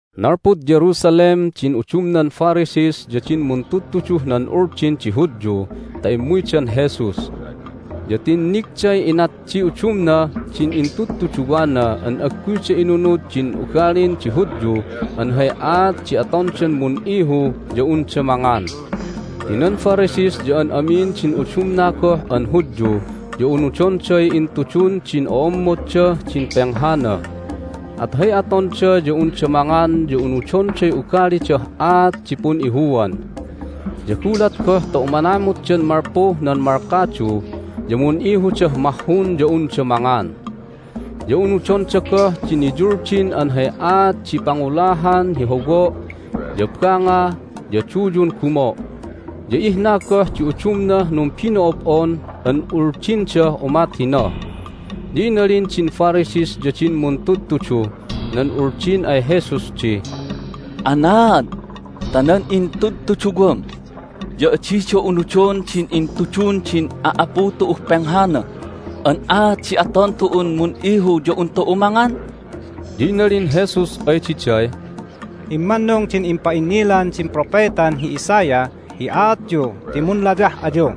Nalpud Jerusalem din udumnan Pharisees ya din muntudtuduh nan Uldin di Hudyu ta immuydan Jesus. Ya tinnigday inat di udumnah din intudtuduwana an agguyda inunud din ugalin di Hudyu an hay aat di atondan mun'ihu ya unda mangan. (Ti nan Pharisees ya an amin din udumna goh an Hudyu ya unudonday intudun din o'ommoddah din penghana, at hay atonda ya unda mangan ya unudonday ugalidah aat di pun'ihuan. Ya gulat goh ta umanamutdan malpuh nan malkadu ya mun'ihudah mahhun ya unda mangan. Ya unudonda goh di niyuldin an hay aat di pangulahan hi howo', ya banga, ya duyun gumo'. Ya ihna goh di udumnah numbino'ob'on an uldindah umat hina.) Ya inalin din Pharisees ya din muntudtuduh nan Uldin ay Jesus di, "Anaad ta nan intudtuduwam ya adida unudon din intudun din a'apu tu'uh penghana an aat di aton tu'un mun'ihu ya un tu'u mangan?" Ya inalin Jesus ay diday, "Immannung din impa'innilan din propetan hi Isaiah hi aatyu ti munlayah ayu!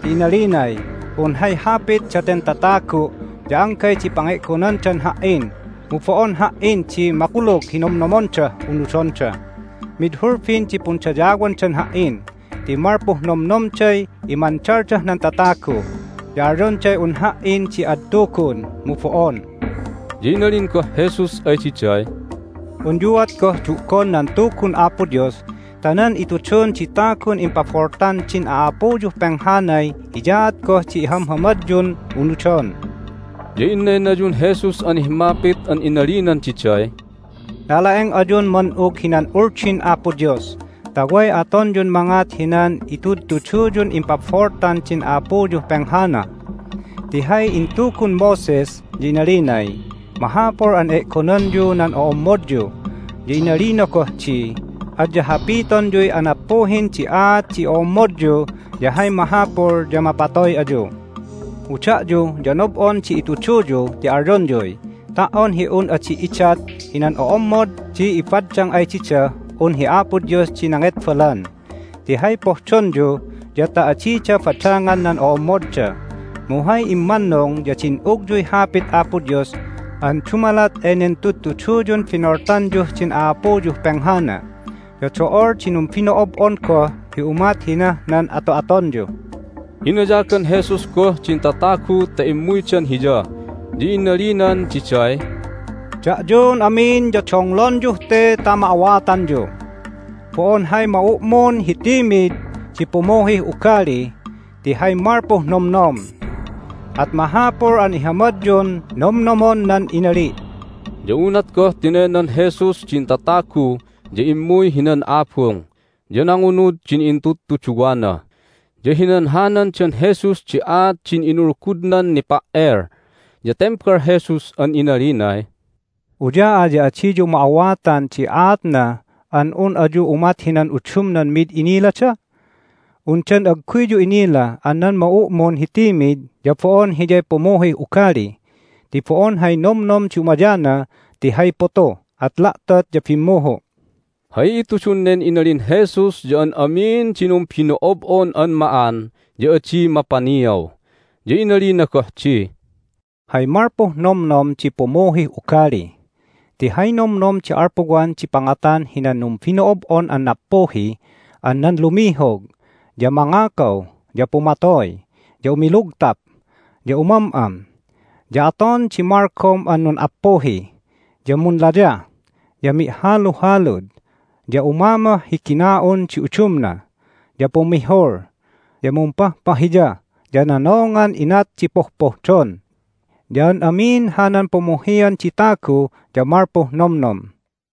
Ti inalinay, Un hay hapit daten tatagu' ya anggay di pange'gonandan Ha"in, mu bo'on Ha"in di makulug hi nomnomondah unudonda. Mid hulbin di pundayawandan Ha"in ti malpuh nomnomday imandaldah nan tatagu, ya alyonday un Ha"in di ad tugun, mu bo'on!" Ya inalin goh Jesus ay diday, "Unyuat goh du'gon nan Tugun Apo Dios ta nan itudun di tagun impaboltan din a'apuyuh penghanay hiyaat goh di ihamhamadyun unudon!" Ya innaynayun Jesus an himmapit an inalinan diday, "Nala'eng ayun man'ug hinan Uldin Apo Dios ta way atonyun mangat hinan itudtuduyun impaboltan din a'apuyuh penghana! Ti hay intugun Moses ya inalinay, Mahapul an e'gonanyu nan o'ommodyu, ya inalina goh di, Adya hapitonyuy anappuhin di aat di o'ommodyu ya hay mahapul ya mapatoy ayu. Mu da'yu ya nob'on di ituduyu ti alyonyuy, Ta"on hi un adi idat hinan o'ommod di ibaddang ay didah un hi Apo Dios di nangetbalan! Ti hay pohdonyu ya ta adida badangan nan o'ommodda. Mu hay immannung ya din'ugyuy Hapit Apo Dios an dumalat enen tudtuduyun binoltanyuh din a'apuyuh penghana. Ya do'ol di numbino'ob'on goh hi umat hinah nan ato'atonyu." Inayagan Jesus goh din tatagu ta immuydan Hiya, ya inalinan diday, "Da'yun amin ya donglonyuh te ta ma'awatanyu! Bo'on hay ma'u'mun hi timid di pumuhih ugali ti hay malpuh nomnom. At mahapul an ihamadyun nomnomon nan inali'!" Ya unat goh tinaynan Jesus din tatagu ya immuy hinan abung. Ya nangunud din intudtuduwana, ya hinanhanandan Jesus di aat din inulgudnan nipa"el. Ya tembal Jesus an inalinay, "Uya'a ya adiyu ma'awatan di aatna an un ayu umat hinan udumnan mid inilada? Undan agguyyu inila an nan ma'u'mun hi timid ya bo'on hiyay pumuhih ugali ti bo'on hay nomnom di umayana ti hay putu, at la'tot ya bimmuhu'." (Hay itudun nen inalin Jesus ya an amin di numbino'ob'on an ma'an ya adi mapaniaw.) Ya inalina goh di, "Hay malpuh nomnom di pumuhih ugali. Ti hay nomnom di alpuwan di pangatan hinan numbino'ob'on an nappuhi an nan lumihog, ya mangakaw, ya pumatoy, ya umilugtap, ya umam'am, ya aton di malgom an nun'appuhi, ya munlayah, ya mi'haluhalud, ya umamoh hi gina'un di udumna, ya pumihul, ya mumpahpahiya, ya nonongan inat di pohpohdon. Ya an amin hanan pumuhian di tagu ya malpuh nomnom."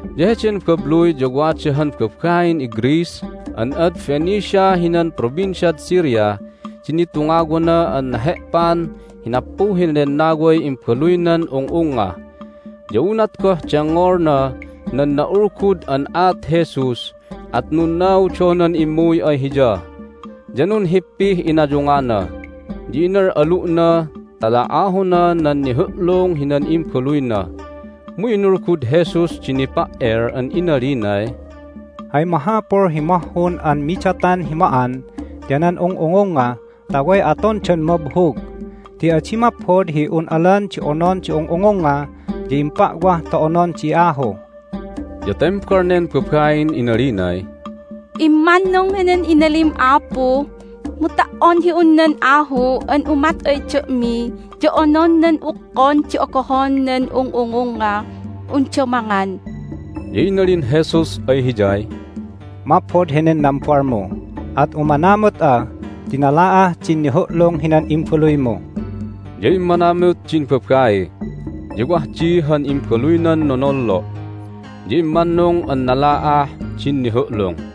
Ya heden babluy ya wada han babain iGreece an ad Phoenicia hinan Provinciad Syria di nitungawana an nahe'pan hi nappuhin lennaway imbaluynan ung'ungnga. Ya unat goh dengngolna nan na'ulgud an aat Jesus at nunnaudonan immuy ay Hiya, ya nunhippih inayungana, ya inal'alu'na ta la'ahona nan nihu'lung hinan imbaluyna. Mu inulgud Jesus di nipa"el an inalinay, "Hay mahapul hi mahhun an midatan hi ma'an ya nan ung'ungungnga ta way atondan mabhug, ti adi maphod hi un alan di onon di ung'ungungnga, ya impa'wah ta onon di ahu." Ya tembal nen babain inalinay, "Immannung henen inalim, Apu, mu ta"on hi un nan ahu an umat ay da'mi ya onon nan ukkon di ogohon nan ung'ungungngah unda mangan!" Ya inalin Jesus ay hiyay, "Maphod henen nambalmu! At umanamut'a ti nala'ah din nihu'lung hinan imbaluymu!" Ya immanamut din babai, ya wah di han imbaluynan nolnollo', ya immannung an nala'ah din nihu'lung.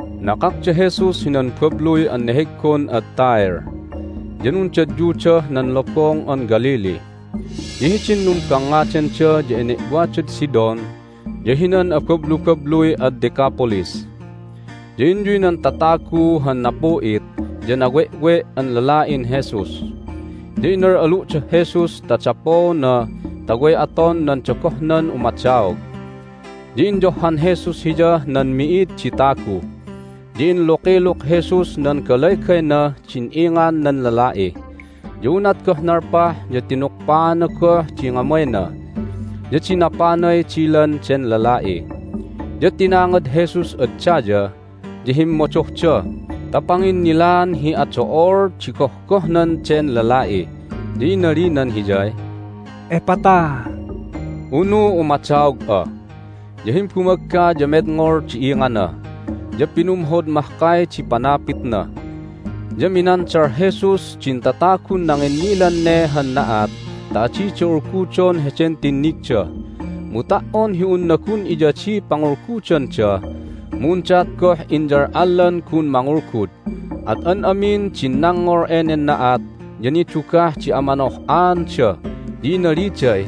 Nakak da Jesus hinan babluy an neheggon ad Tyre, ya nundadyudah nan Lobong an Galilee. Ya hidin numbangngadanda ya ene'wadad Sidon ya hinan abablubabluy ad Decapolis. Ya inyuy nan tatagu han napu'it ya nawe'we' an lala'in Jesus. Ya inal'alu'dah Jesus ta dapoona ta way aton nan dogohnan umadaog. Ya inyohhan Jesus hiyah nan mi'id di tagu, ya inlukiluk Jesus nan galaygaynah din ingan nan lala'i. Ya unat goh nalpah ya tinukpaana goh di ngamayna, ya dinapanay dilan den lala'i. Ya tinangad Jesus ad daya, ya himmodohda ta panginnilaan hi ado'ol di gohgohnan den lala'i, ya inalinan hiyay, "Ephphatha!" (unu Umadaog'a!). Ya himbumagga ya medngol di ingana, ya pinumhod mahkay di panapitna. Ya minandal Jesus din tatagun nanginnilan ne han na'at ta adida ulgudon heden tinnigda. Mu ta"on hi unna gun iyadiy pangulgudanda mu undaat goh inyal'allan gun mangulgud. At an amin din nangngol enen na'at ya nidugah di amanoh'aanda. Ya inaliday,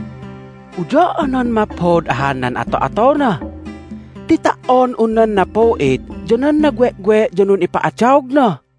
"Uya'anan maphod ahan nan ato'atona! Ti ta"on un nan napu'it ya nan nawe'we' ya nun'ipa'adaogna!"